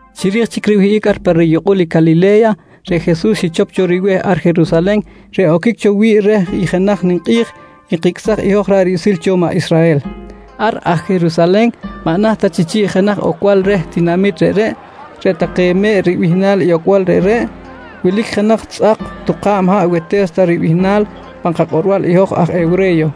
Chiri̱j chic riwihꞌic ar pa riyukꞌul i Calile̱ya, reꞌ Jesus xichop cho ribe̱h ar Jerusalen reꞌ oquic cho wi̱ꞌ reh i jenaj ninkꞌi̱j nkicꞌsaj i hoj ra̱ꞌ riꞌsil cho maꞌ Israhel. Ar aj Jerusalen maꞌ naht ta chi chi̱ꞌ jenaj ocbal reh tinamit reꞌreꞌ, “Reꞌ Take Me̱ꞌ” ribihnal i ocbal reꞌreꞌ, wilic jenaj tzꞌak tuka̱b haꞌ Wete̱sta ribihnal pan kakꞌorbal i hoj aj hewre̱yo.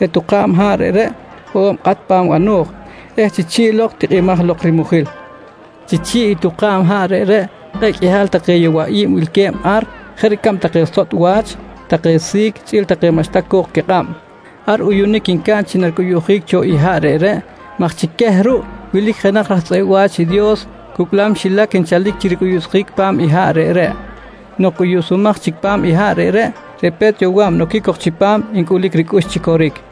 Reꞌ tuka̱b haꞌ reꞌreꞌ hoꞌo̱b kꞌat pa̱m bano̱j eh chi chi̱ꞌ lok tikꞌimaj lok rimujil. Chi chi̱ꞌ i tuka̱b haꞌ reꞌreꞌ kꞌe̱ꞌ qꞌuihal take yowaꞌi̱b wilque̱b ar jeꞌ ricab take sotꞌ wach, take si̱c chꞌi̱l take maꞌxta co̱k quikꞌab. Ar uyunic ncaꞌn chi naricꞌuyuꞌjic cho i haꞌ reꞌreꞌ maj chi queh ruꞌ wilic jenaj raj tzꞌeꞌ wa̱ch i Dios cucꞌlam xilac nchalic chi ricꞌuyuꞌsjic pa̱m i haꞌ reꞌreꞌ. Nok cꞌuyuꞌsumaj chic pa̱m i haꞌ reꞌreꞌ, reꞌ pe̱t yowa̱b noquic cok chipam ncꞌulic ricꞌux chi coric.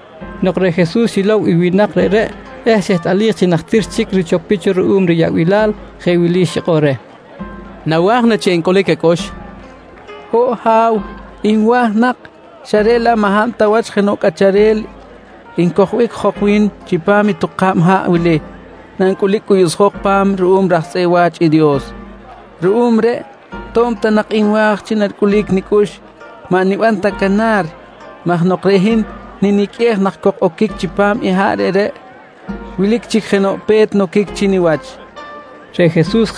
Nok reꞌ Jesus xilow i winak reꞌreꞌ eh xehtꞌalij chi najtir chic richopic cho ruꞌum riyaꞌbilal jeꞌ wili xikꞌor reh: «Nawa̱j na chi encꞌulic acꞌux? nqui reh. «Ho̱ꞌ Ha̱w, nwa̱j nak xa reꞌ laꞌ maꞌ hab ta wach jenoꞌ cꞌacharel ncojbic jok wi̱n chipam i tuka̱b haꞌ wili nancꞌulic cꞌuyuꞌsjok pa̱m ruꞌum raj tzꞌeꞌ wa̱ch i Dios. Ruꞌum reꞌ to̱b ta nak nwa̱j chi naricꞌulic nicꞌux, maꞌ niban ta canar maj nok reꞌ hin niniqꞌuej nak cok oquic chipam haꞌ reꞌreꞌ, wilic chic jenoꞌ pe̱t noquic chi niwach, nqui reh Jesus.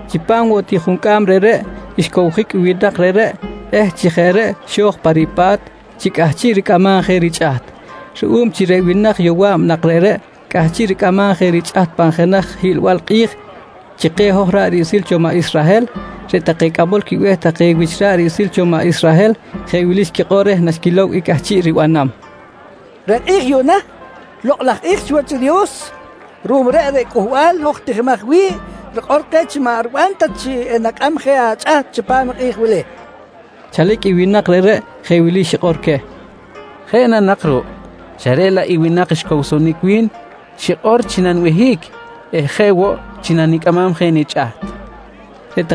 Chipam woꞌ ti juncꞌam reꞌreꞌ, xcowjic i winak reꞌreꞌ eh chi jeꞌ reꞌ xo̱j pa ripa̱t chi cꞌahchiꞌ ricꞌamam je richꞌaht. Ruꞌum chi reꞌ winak yowa̱b nak reꞌreꞌ cꞌahchiꞌ ricꞌamam je richꞌaht pan jenaj hiꞌlbal kꞌi̱j chi keh hoj ra̱ꞌ riꞌsil cho maꞌ Israhel, reꞌ take cꞌamol quibe̱h take wich ra̱ꞌ riꞌsil cho maꞌ Israhel jeꞌ wili xquikꞌor reh naxquilow i cꞌahchiꞌ ribanam: «Reꞌ kꞌi̱j yuꞌna, lokꞌ laj kꞌi̱j chiwach i Dios. Ruꞌum reꞌ, reꞌ cꞌuhbal hoj tijimaj wi̱ꞌ rikꞌor keh chi maꞌ riban ta chi enacꞌam je achꞌaht chipam i kꞌi̱j wili, nqui take. Chalic i winak reꞌreꞌ jeꞌ wili xikꞌor queh: «Jeꞌ na nak ruꞌ, xa reꞌ laꞌ i winak xcowsonic wi̱n xikꞌor chi nanibehic eh jeꞌ woꞌ chi nanicꞌamam je nichꞌaht, nqui queh.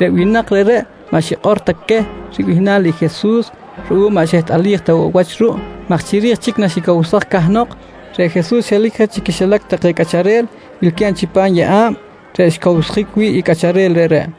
Reꞌ winak reꞌreꞌ maꞌ xikꞌor ta queh ribihnal i Jesus ruꞌum maꞌ xehtꞌalij ta woꞌ wach ruꞌ maj chiri̱j chic naxicowsaj cahnok, reꞌ Jesus xelic je chi quixilac take cꞌacharel wilque̱b chipam yeꞌa̱b reꞌ xcowsjic wi̱ꞌ i cꞌacharel reꞌreꞌ.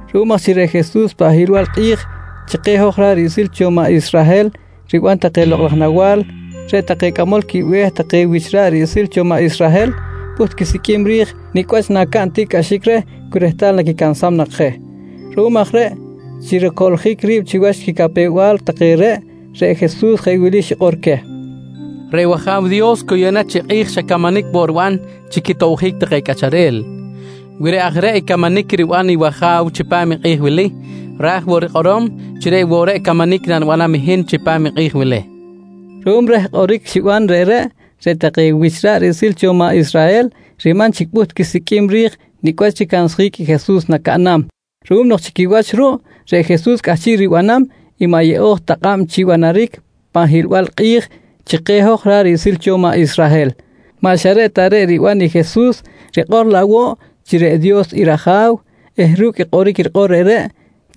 Ruꞌum aj chi reꞌ Jesus pan hiꞌlbal kꞌi̱j chi keh hoj ra̱ꞌ riꞌsil cho maꞌ Israhel riban take lokꞌ laj nawa̱l, reꞌ take cꞌamol quibe̱h take wich ra̱ꞌ riꞌsil cho maꞌ Israhel pꞌuht quisiqꞌuim ri̱j nicꞌ wach nacaꞌn tiꞌcꞌaxic reh cu rehtal naquicansam nak je. Ruꞌum aj reꞌ chi ricoꞌljic ri̱b chiwach quicapew-bal take reꞌ, reꞌ Jesus jeꞌ wili xikꞌor queh: «Reꞌ wAja̱w Dios cu yuꞌna chi kꞌi̱j xa camanic woꞌ riban chi quitobjic take cꞌacharel. Wi reꞌ aj reꞌ i camanic riban i wAja̱w chipam i kꞌi̱j wili, ra̱j woꞌ rikꞌorom chi reꞌ woꞌ reꞌ camanic nanibanam hin chipam i kꞌi̱j wili, nqui queh. Ruꞌum reh kꞌoric xiban reꞌreꞌ, reꞌ take wich ra̱ꞌ riꞌsil cho maꞌ Israhel riman chic pꞌuht quisiqꞌuim ri̱j nicꞌ wach ricansjic i Jesus nacaꞌnam ruꞌum nok chi quiwach ruꞌ, reꞌ Jesus cꞌahchiꞌ ribanam i maꞌ yeꞌo̱j ta kꞌab chi banaric pan hiꞌlbal kꞌi̱j chi keh hoj ra̱ꞌ riꞌsil cho maꞌ Israhel. Maꞌ xa reꞌ ta reꞌ riban i Jesus rikꞌor laꞌ woꞌ chi reꞌ Dios i rAja̱w eh ru̱cꞌ i kꞌoric rikꞌor reꞌreꞌ,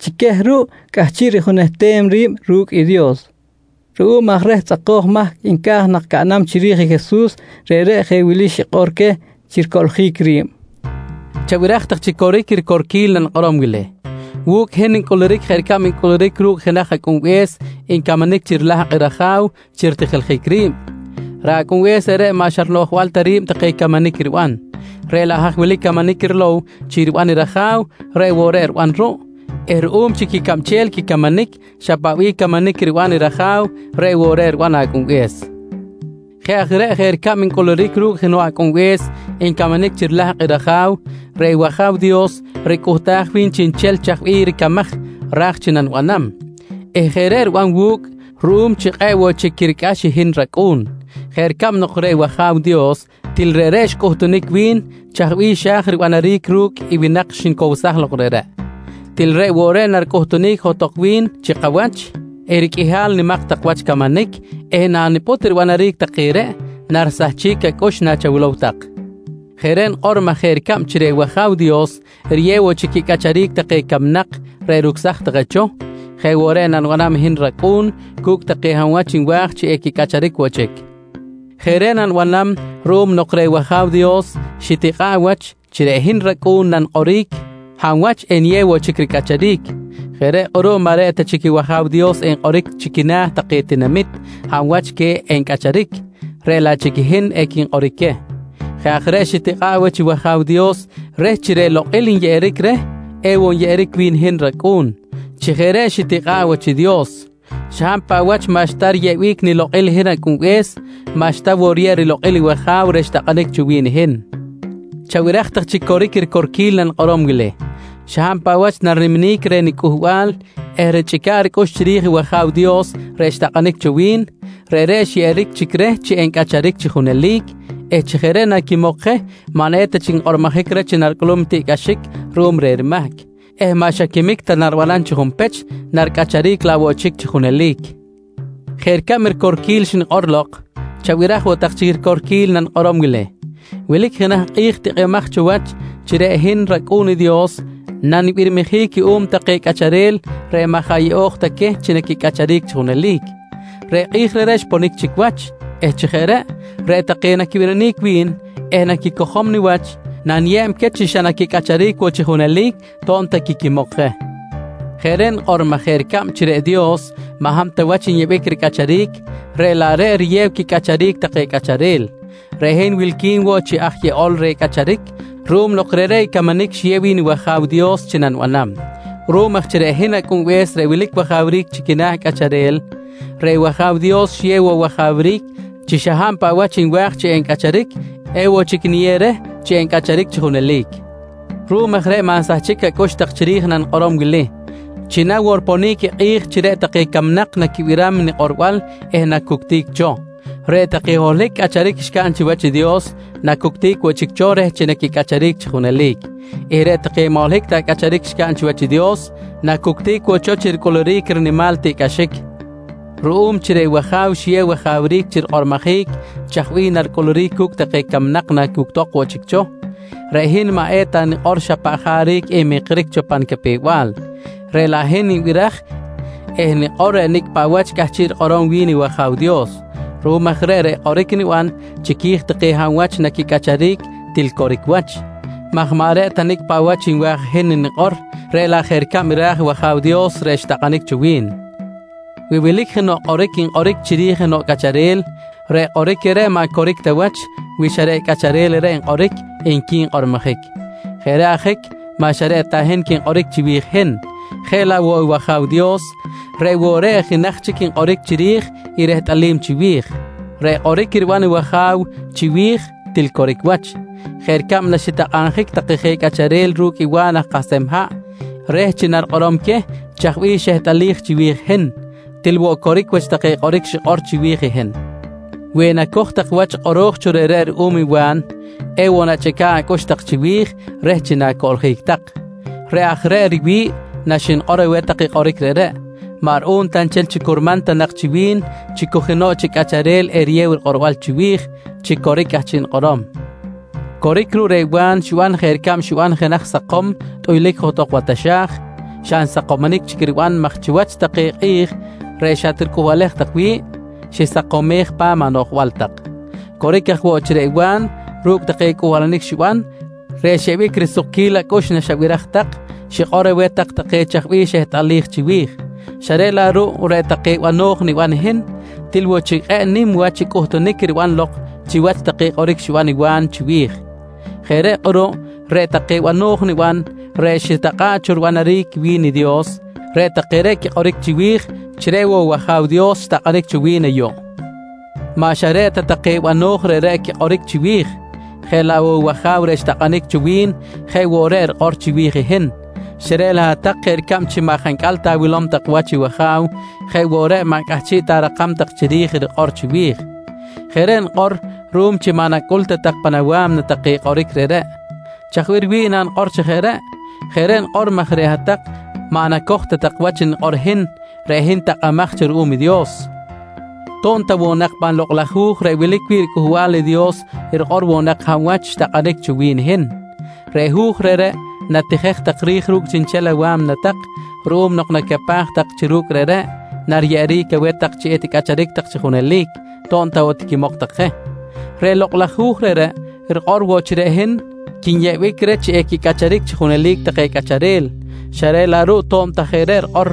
chi queh ruꞌ cꞌahchiꞌ rijunehtem ri̱b ru̱cꞌ i Dios. Ruꞌum aj reh tzꞌakoj mahc nca̱j nak caꞌnam chiri̱j i Jesus, reꞌreꞌ jeꞌ wili xikꞌor queh chi ricoꞌljic ri̱b: «Chabiraj tak chi coric i ricorquil nanikꞌorom wili: Wu̱cꞌ hin ncꞌuluric jeꞌ ricab ncꞌuluric ru̱cꞌ jenaj acꞌunbe̱s ncamanic chi rilahkꞌ i raja̱w chi ritijiljic ri̱b. Reꞌ acꞌunbe̱s reꞌreꞌ maꞌ xa rinoꞌjbal ta ri̱b take camanic riban, reꞌ laꞌ haj wilic i camanic rilow chi riban i raja̱w reꞌ woꞌ reꞌ riban ruꞌ eh ruꞌum chi quicabchel quicamanic, xa paꞌ bih camanic riban i raja̱w reꞌ woꞌ reꞌ riban acꞌunbe̱s. «Jeꞌ aj reꞌ jeꞌ ricab ncꞌuluric ru̱cꞌ jenoꞌ acꞌunbe̱s ncamanic chi rilahkꞌ i raja̱w, reꞌ wAja̱w Dios ricꞌuhtaj wi̱n chiꞌnchel chaj bih ricamaj ra̱j chi nanibanam eh jeꞌ reꞌ riban wu̱cꞌ ruꞌum chi kꞌe̱ꞌ woꞌ chic quiricꞌax i hin racꞌu̱n. Jeꞌ ricab nok reꞌ wAja̱w Dios til reꞌreꞌ xcꞌuhtunic wi̱n chaj bih xa̱j ribanaric ru̱cꞌ i winak xnicowsaj lok reꞌreꞌ, til reꞌ woꞌ reꞌ naricꞌuhtunic johtok wi̱n chi kawach i riqꞌuihal nimak tak wach camanic eh nanipꞌut ribanaric take reꞌ, narisahchic acꞌux nachawilow tak. Jeꞌ reꞌ nikꞌor maj jeꞌ ricab chi reꞌ wAja̱w Dios riyew woꞌ chic quicꞌacharic take camnak reꞌ rucsaj take cho, jeꞌ woꞌ reꞌ nanibanam i hin rAcꞌu̱n cu̱cꞌ take hab wach nwa̱j chi equicꞌacharic woꞌ chic. Jeꞌ reꞌ nanibanam ruꞌum nok reꞌ wAja̱w Dios xitikꞌa̱ꞌ wach chi reꞌ hin rAcꞌu̱n nanikꞌoric hab wach eniyew woꞌ chic ricꞌacharic. Jeꞌ reꞌ kꞌuruꞌ maꞌ reꞌ ta chic i wAja̱w Dios enkꞌoric chi quina̱ take tinamit hab wach queh equicꞌacharic, reꞌ laꞌ chic i hin equinkꞌoric queh. Reꞌ aj reꞌ xitakꞌa̱ꞌ wach i wAja̱w Dios reh chi reꞌ lokꞌil nyeꞌeric reh ewoꞌ enyeꞌeric wi̱n hin rAcꞌu̱n. Chi jeꞌ reꞌ xitikꞌa̱ꞌ wach i Dios, xa hab paꞌ wach maꞌxta riyeꞌbic nilokꞌil i hin Acꞌunbe̱s, maꞌxta woꞌ riyeb rilokꞌil i wAja̱w reꞌ xtakꞌanic cho wi̱n hin. «Chabiraj tak chi coric i ricorquil nanikꞌorom wili: Xa hab paꞌ wach nariniminic reh niCꞌuhbal eh richꞌica̱ꞌ ricꞌux chiri̱j i wAja̱w Dios reꞌ xtakꞌanic cho wi̱n, reꞌreꞌ xyeꞌeric chic reh chi encꞌacharic chi junelic eh chi jeꞌ reꞌ naquimok je maꞌ eta chic nkꞌormojic reh chi naricꞌulum i tiꞌcꞌaxic ruꞌum reh rimahc eh maꞌ xa quimic ta naribanam chi junpech, naricꞌacharic laꞌ woꞌ chic chi junelic. «Jeꞌ ricab i ricorquil xnikꞌor lok, chabiraj woꞌ tak chic i ricorquil nanikꞌorom wili: Wilic jenaj i kꞌi̱j tikꞌimaj wach chi reꞌ hin rAcꞌu̱n i Dios nanibirmijic cuꞌum take cꞌacharel reꞌ maꞌ jaꞌ yeꞌo̱j ta queh chi equicꞌacharic chi junelic. Reꞌ kꞌi̱j reꞌreꞌ xponic chic wach eh chi jeꞌ reꞌ, reꞌ take naquibirinic wi̱n eh naquicojom niwach naniyeb queh chi xa naquicꞌacharic woꞌ chi junelic to̱b ta quiquimok je. Jeꞌ reꞌ nikꞌor maj jeꞌ ricab chi reꞌ Dios maꞌ hab ta wach nyeꞌbic ricꞌacharic reꞌ laꞌ reꞌ riyew quicꞌacharic take cꞌacharel, reꞌ hin wilqui̱n woꞌ chi aj yeꞌol reh cꞌacharic ruꞌum nok reꞌreꞌ i camanic xiyew wi̱n i wAja̱w Dios chi nanibanam. Ruꞌum aj chi reꞌ hin Acꞌunbe̱s reꞌ wilic wajawric chi quina̱ cꞌacharel, reꞌ wAja̱w Dios xiyew woꞌ wajawric chi xa hab paꞌ wach nwa̱j chi encꞌacharic, ewoꞌ chic niyew reh chi encꞌacharic chi junelic. Ruꞌum aj reꞌ maꞌ nsahchic acꞌux tak chiri̱j i nanikꞌorom wili chi na woꞌ riponic i kꞌi̱j chi reꞌ take camnak naquibiram i nikꞌorbal eh nacuctic cho. Reꞌ take holohic cꞌacharic xcaꞌn chiwach i Dios, nacuctic woꞌ chic cho reh chi naquicꞌacharic chi junelic eh reꞌ take maꞌ holohic ta cꞌacharic xcaꞌn chiwach i Dios, nacuctic woꞌ cho chi ricꞌuluric i rinimal tiꞌcꞌaxic. «Ruꞌum chi reꞌ wAja̱w xiyew wajawric chi rikꞌormojic chaj bih naricꞌuluric cu̱cꞌ take camnak nacuctok woꞌ chic cho, reꞌ hin maꞌ eta nikꞌor xa paꞌ jaric nmikric cho pa nicapew-bal, reꞌ laꞌ hin nibiraj eh nikꞌor reꞌ nicꞌ paꞌ wach cꞌahchiꞌ rikꞌorom wi̱n i wAja̱w Dios. Ruꞌum aj reꞌ, reꞌ kꞌoric niban chiqui̱j take hab wach naquicꞌacharic til coric wach, maj maꞌ reꞌ ta nicꞌ paꞌ wach nwa̱j i hin nikꞌor, reꞌ laꞌ jeꞌ ricab ra̱j i wAja̱w Dios reꞌ xtakꞌanic cho wi̱n. Wi wilic jenoꞌ kꞌoric nkꞌoric chiri̱j jenoꞌ cꞌacharel, reꞌ kꞌoric reꞌreꞌ maꞌ coric ta wach wi xa reꞌ i cꞌacharel reꞌreꞌ nkꞌoric, nqui nkꞌormojic. Jeꞌ reꞌ ajic maꞌ xa reꞌ ta hin quinkꞌoric chiwi̱j i hin, jeꞌ laꞌ woꞌ i wAja̱w Dios, reꞌ woꞌ reꞌ i jenaj chic nkꞌoric chiri̱j i rehtꞌalim chiwi̱j. Reꞌ kꞌoric riban i wAjaw chiwi̱j til coric wach jeꞌ ricab naxitakꞌabjic take je cꞌacharel ru̱cꞌ i Wa̱n aj kahsem haꞌ reh chi narikꞌorom queh chaj bih xehtꞌalij chiwi̱j i hin, til woꞌ coric wach take kꞌoric xikꞌor chiwi̱j i hin. Wi enacoj tak wach kꞌoro̱j cho reꞌreꞌ ruꞌum i Wa̱n, ewoꞌ nachꞌica̱ꞌ acꞌux tak chiwi̱j reh chi na̱coꞌljic tak. Reꞌ aj reꞌ riwi̱ꞌ naxnikꞌor aweh tak i kꞌoric reꞌreꞌ, maꞌ ruꞌum ta nchel chi curman ta nak chi wi̱n chi cu jenoꞌ chic cꞌacharel eriyew rikꞌorbal chiwi̱j chi coric i cꞌahchiꞌ nikꞌorom. «Coric ruꞌ reꞌ Wa̱n xiban jeꞌ ricab riban jenaj sakom tꞌuylic johtok wa taxa̱j xa nsakomonic chic riban maj chiwach take kꞌi̱j reꞌ xatricꞌuhbalej tak wi̱ꞌ, xisakomej pa̱m anoꞌjbal tak. Coric aj woꞌ chi reꞌ Wa̱n ru̱cꞌ take cꞌuhbalanic xiban reꞌ xyeꞌbic risukquil acꞌux naxabiraj tak, xikꞌor aweh tak take chaj bih xehtꞌalij chiwi̱j xa reꞌ laꞌ ruꞌ reꞌ take bano̱j niban i hin, til woꞌ chic kꞌe̱ꞌ nim wach i cꞌuhtunic riban lok chiwach take kꞌoric xiban i Wa̱n chiwi̱j. Jeꞌ reꞌ kꞌuruꞌ reꞌ take bano̱j niban reꞌ xitakꞌa̱ꞌ cho ribanaric wi̱n i Dios, reꞌ take reꞌ quikꞌoric chiwi̱j chi reꞌ woꞌ wAja̱w Dios xtakꞌanic cho wi̱n ayuꞌ. «Maꞌ xa reꞌ ta take bano̱j reꞌreꞌ quikꞌoric chiwi̱j, je laꞌ woꞌ i wAja̱w reꞌ xtakꞌanic cho wi̱n je woꞌ reꞌ rikꞌor chiwi̱j i hin, xa reꞌ laꞌ hat-tak jeꞌ ricab chi maꞌ jancꞌal ta awilom tak wach i wAja̱w jeꞌ woꞌ reꞌ maꞌ cꞌahchiꞌ ta arakam tak chiri̱j i rikꞌor chiwi̱j. Jeꞌ reꞌ nikꞌor ruꞌum chi maꞌ nacꞌul ta tak pan awa̱mna take kꞌoric reꞌreꞌ. Chaj bih riwi̱ꞌ nanikꞌor chi jeꞌ reꞌ? Jeꞌ reꞌ nikꞌor maj reꞌ hat-tak maꞌ nacoj ta tak wach nikꞌor i hin, reꞌ hin takꞌamaj cho ruꞌum i Dios to̱b ta woꞌ nak pan Lokꞌ laj Hu̱j reꞌ wilic wi̱ꞌ riCꞌuhbal i Dios rikꞌor woꞌ nak hab wach xtakꞌanic cho wi̱n i hin. Reꞌ hu̱j reꞌreꞌ natijej tak ri̱j ru̱cꞌ chiꞌnchel awa̱mna tak ruꞌum nok nacapaj tak chi ru̱cꞌ reꞌreꞌ, nariyeꞌeric aweh tak chi eticꞌacharic tak chi junelic to̱b ta woꞌ tiquimok tak je. Reꞌ Lokꞌ laj Hu̱j reꞌreꞌ rikꞌor woꞌ chi reꞌ hin quinyeꞌbic reh chi equicꞌacharic chi junelic take cꞌacharel xa reꞌ laꞌ ruꞌ to̱b ta jeꞌ reꞌ rikꞌor,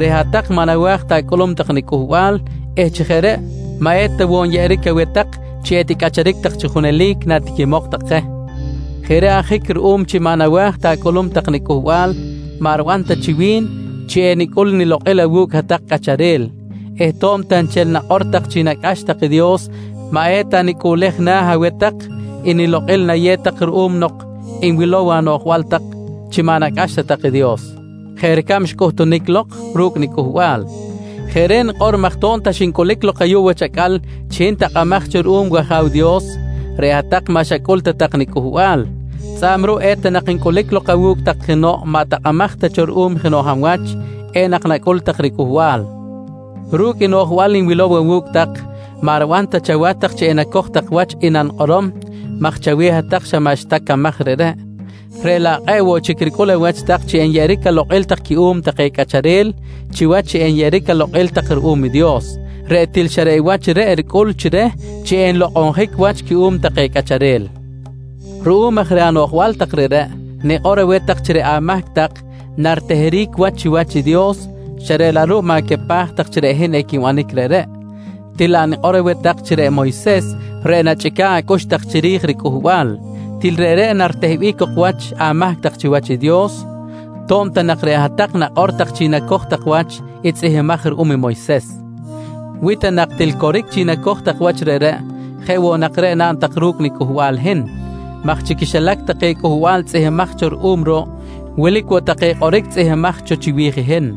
reꞌ hat-tak maꞌ nawa̱j ta acꞌulum tak niCꞌuhbal eh chi jeꞌ reꞌ maꞌ eta woꞌ nyeꞌeric aweh tak chi eticꞌacharic tak chi junelic natiquimok tak je. «Jeꞌ reꞌ ajic ruꞌum chi maꞌ nawa̱j ta acꞌulum tak niCꞌuhbal maꞌ riban ta chi wi̱n chi enicꞌul nilokꞌil awu̱cꞌ hat-tak cꞌacharel eh to̱b ta nchel nakꞌor tak chi nacꞌax tak i Dios maꞌ eta nicꞌuꞌlej na̱ aweh tak i nilokꞌil nayew tak ruꞌum nok nwilow anoꞌjbal tak chi maꞌ nacꞌax ta tak i Dios jeꞌ ricab xcꞌuhtunic lok ru̱cꞌ nicꞌulbal. Jeꞌ reꞌ nikꞌor maj to̱b ta xincꞌulic lok ayuꞌ wach acꞌal chi hin takꞌamaj cho ruꞌum i wAja̱w Dios reꞌ hat-tak maꞌ xacꞌul ta tak niCꞌuhbal, tzꞌa̱b ruꞌ eta nak ncꞌulic lok awu̱cꞌ tak jenoꞌ maꞌ takꞌamaj ta cho ruꞌum jenoꞌ hab wach, enak nacꞌul tak ricꞌuhbal. «Ru̱cꞌ i noꞌjbal nwilow awu̱cꞌ tak maꞌ riban ta chawach tak chi enacoj tak wach i nanikꞌorom maj chaweh hat-tak xa maꞌxta camaj reꞌreꞌ, reꞌ laꞌ kꞌe̱ꞌ woꞌ chic ricꞌul awach tak chi enyeꞌeric alokꞌil tak cuꞌum take cꞌacharel chiwach chi enyeꞌeric alokꞌil tak ruꞌum i Dios reꞌ til xa reꞌ wach reꞌ ricꞌul chi reh chi enlokꞌonjic wach cuꞌum take cꞌacharel. Ruꞌum aj reh anoꞌjbal tak reꞌreꞌ, nikꞌor aweh tak chi reꞌ amahc tak nariteheric wach chiwach i Dios xa reꞌ laꞌ ruꞌ ma̱capaj tak chi reꞌ hin equinbanic reꞌreꞌ. Til laꞌ nikꞌor aweh tak chi reꞌ Moyses reꞌ nachꞌica̱ꞌ acꞌux tak chiri̱j ricꞌuhbal, til reꞌreꞌ naritehbic cok wach amahc tak chiwach i Dios to̱b ta nak reꞌ hat-tak nakꞌor tak chi nacoj tak wach i tzꞌihmbimaj ruꞌum i Moyses. «Wi ta nak til coric chi nacoj tak wach reꞌreꞌ, jeꞌ woꞌ nak reꞌ naꞌn tak ru̱cꞌ niCꞌuhbal hin maj chi quixilac take cꞌuhbal tzꞌihmbimaj cho ruꞌum ruꞌ, wilic woꞌ take kꞌoric tzꞌihmbimaj cho chiwi̱j i hin.